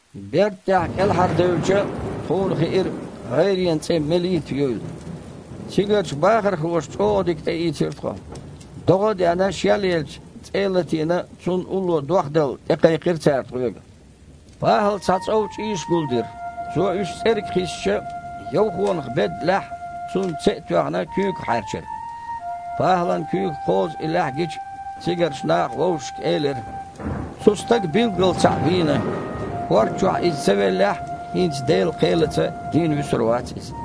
Берда тІехь кІелхьардевлча, тхуна хиира гІайренан цІе Мелита юйла. Цигарчу бахархоша чІогІа дика тІеийцира тхо. ДогІа а деана, шелъелча, цІе а латийна, цунна улло дохдала тІекхайкхира цара тхоьга. ПахІала цхьа цІов чІийш гулдира. Цо уьш цІерга кхиссича, йовхонах бедда лаьхьа, цунна це а тоьхна, куьйгах хьаьрчира. ПахІалан куьйгах кхозу и лаьхьа гича, цигарчу наха вовшашка элира: «Цу стага, билггала, цхьаъ вийна. ХІорда чохь иза ца веллехь а, хІинца Делан кхелаца дийна вуьсур вац иза».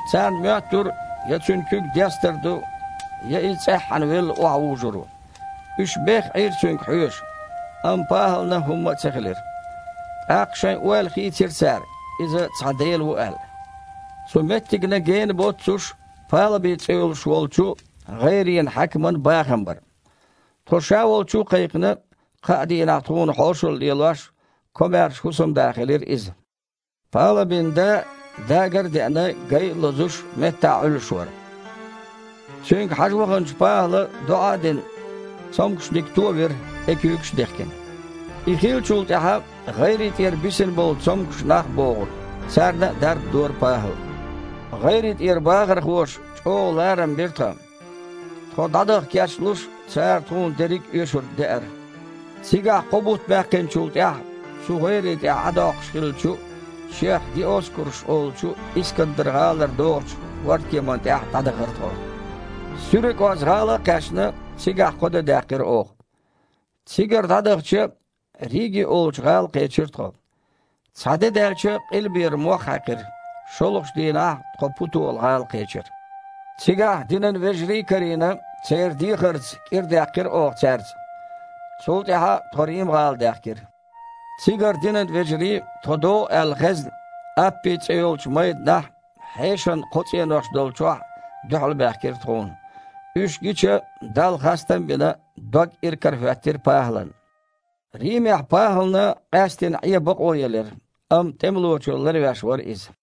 Царна моьттура, я цуьнан куьг дестар ду, я иза цІеххьана велла охьавужур ву. Уьш бехха Іийра цуьнга хьоьжуш, амма ПахІална хІумма а ца хилира. ТІаккха шайн ойла хийцира цара, иза цхьа Дела ву аьлла. Цу меттигна гена боццуш Палаби цІе йолуш волчу гІайренан хьаькаман бахам бара. Тхо ша волчу а кхайкхина, кхаа дийнахь тхуна хьошалла лелош, комаьрша хІусамда хилира иза. Палабин да, дагар а деана, гай а лозуш, меттахь Іуьллуш вара. Цуьнга хьажа ваханчу ПахІала, доІа а дина, цомгушниг товира, тІе куьйгаш а дехкина. И хиллачул тІаьхьа гІайре тІера бисина болу цомгуш нах а богІура. Царна а дарба дора ПахІала. ГІайре тІера бахархоша чІогІа ларам бира тхан. Тхо дІадаха кечлуш, цара тхуна дерриг а оьшург деара. Цигахь кхо бутт баьккхинчул тІаьхьа, цу гІайре тІехь Іа доккхуш хиллачу, шех Диоскураш олучу Искандар-гІалара догІучу хІордкеманна тІехь дІадахара тхо. СуьракІоз-гІала а кхаьчна, цигахь кхо де даьккхира оха. Цигара дІадахча, Риги олучу гІала кхечира тхо. Цхьа де даьлча, къилбера мох хьаькхира. ШолгІачу дийнахь тхо Путола-гІала кхечира. Цигахь динан вежарий а карийна, церан дехарца кІира даьккхира оха цаьрца. Цул тІаьхьа тхо Рим-гІала даьхкира. Цигара динан вежарий, тхо догІу аьлла хезна, Аппи цІе йолчу майданахь а, хьешан кхо цІенош долчохь а дуьхьалбаьхкира тхуна. Уьш гича, Далла хастам а бина, дог иракарахІоьттира ПахІалан. Римехь ПахІална къаьстина Іе бакъо елира, амма тІемалочо ларвеш вара иза.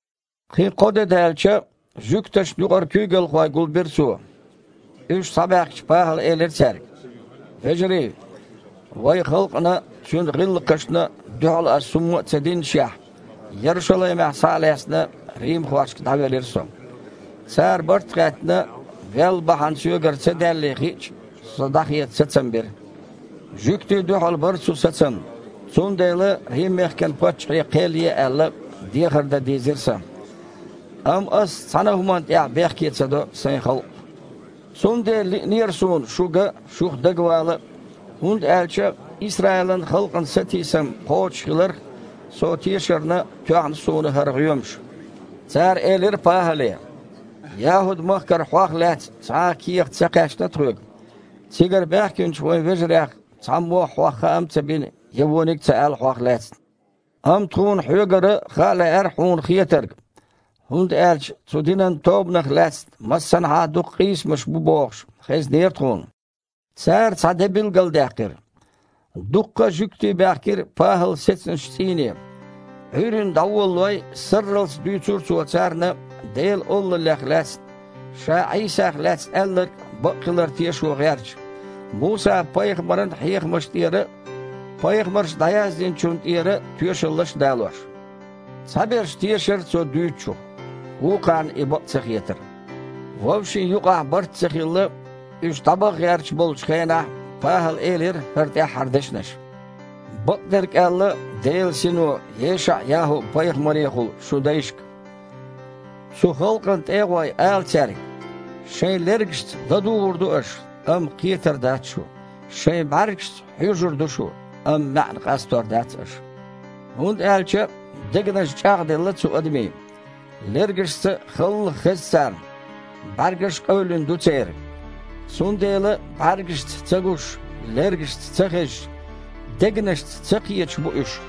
Кхин кхо де даьлча, жуьгташна юкъара куьйгалхой гулбира цо. Уьш схьабаьхкича, ПахІала элира цаьрга: «Вежарий! Вайн халкъана а, цуьнан гІиллакхашна а дуьхьал ас хІумма а ца диннашехь, Ярушалаймехь, схьа а лаьцна, римхошка дІавелира со. Цара, барт а хаьттина, вел бахьана соьгара ца даьллий хиъча, со дІахеца сацам бира. Жуьгтий дуьхьал бара цу сацамна, цундела Рим-мехкан паччахье кхел е аьлла, дехар дан дийзира сан. Амма ас цхьана а хІуманна тІехь бехке ца до сайн халкъ. Цундела лиънера суна шу ган а, шух дагавала а, хІунда аьлча Исраилан халкъан сатийсам кхочушхиларх со тешарна тоьхна суна хІара гІоьмаш». Цара элира ПахІале: «ЯхІуд-махкара хьох лаьцна цхьа а кехат ца кхаьчна тхоьга. Цигара баьхкинчу вайн вежарех цхьаммо а хьох хаам а ца бина, я вониг а ца аьлла хьох лаьцна. Амма тхуна хьоьгара хаа лаьара хьуна хетарг, хІунда аьлча цу динан тобанах лаьцна массанхьа а дукха къийсамаш бу бохуш, хезнера тхуна». Цара цхьа де билгалдаьккхира. Дуккха а жуьгтий баьхкира ПахІал сецначу цІийне. Іуьйранна дІаволалой, сарралц дуьйцура цо царна Делан Олаллех лаьцна, ша Іийсах лаьцна аьлларг бакъ хилар тешо гІерташ, Муса-пайхамаран хьехамаш тІера а, пайхамарша дІаяздинчунна тІера а тоьшаллаш а далош. Цхьаберш тешара цо дуьйцучух, вукхарна и бакъ ца хетара. Вовшийн юкъахь барт а ца хилла, уьш дІабаха гІерташ болчу хенахь, ПахІала элира хІара тІаьххьара дешнаш: «Бакъдерг аьлла Делан Сино ЕшаІ-ЯхІу-пайхамарехула шун дайшка: „Цу халкъана тІе а гІой, ала цаьрга: Шайн лергашца ладугІур ду аш, амма кхетар дац шу, шайн бІаьргашца хьоьжур ду шу, амма маьІна къастор дац аша. ХІунда аьлча дегнаш чІагІделла цу адамийн, лергашца халла хеза царна, бІаьргаш а къевлина ду церан. Цундела бІаьргашца ца гуш, лергашца ца хезаш, дегнашца ца кхеташ бу уьш.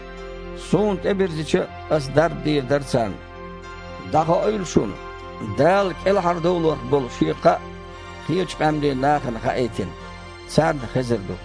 Суна тІебирзича, Ас дарба дийр дара царна“». «ДІахоуьйла шуна, Дала кІелхьардовларх болу Шен кхаъ кхечу къаьмнийн нахана хаийтина: царна хезар ду».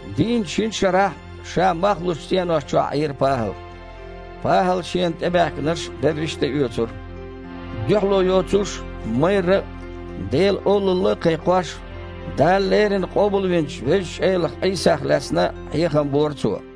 Дийнна шина шарахь ша мах лучу цІенош чохь Іийра ПахІал. ПахІала шена тІебаьхкинарш берриш а тІеоьцура. Дуьхьало йоцуш а, майрра а Делан Олалла а кхайкхош, Дала леррина къобалвинчу Везачу Элах Іийсах лаьцна хьехам бора цо.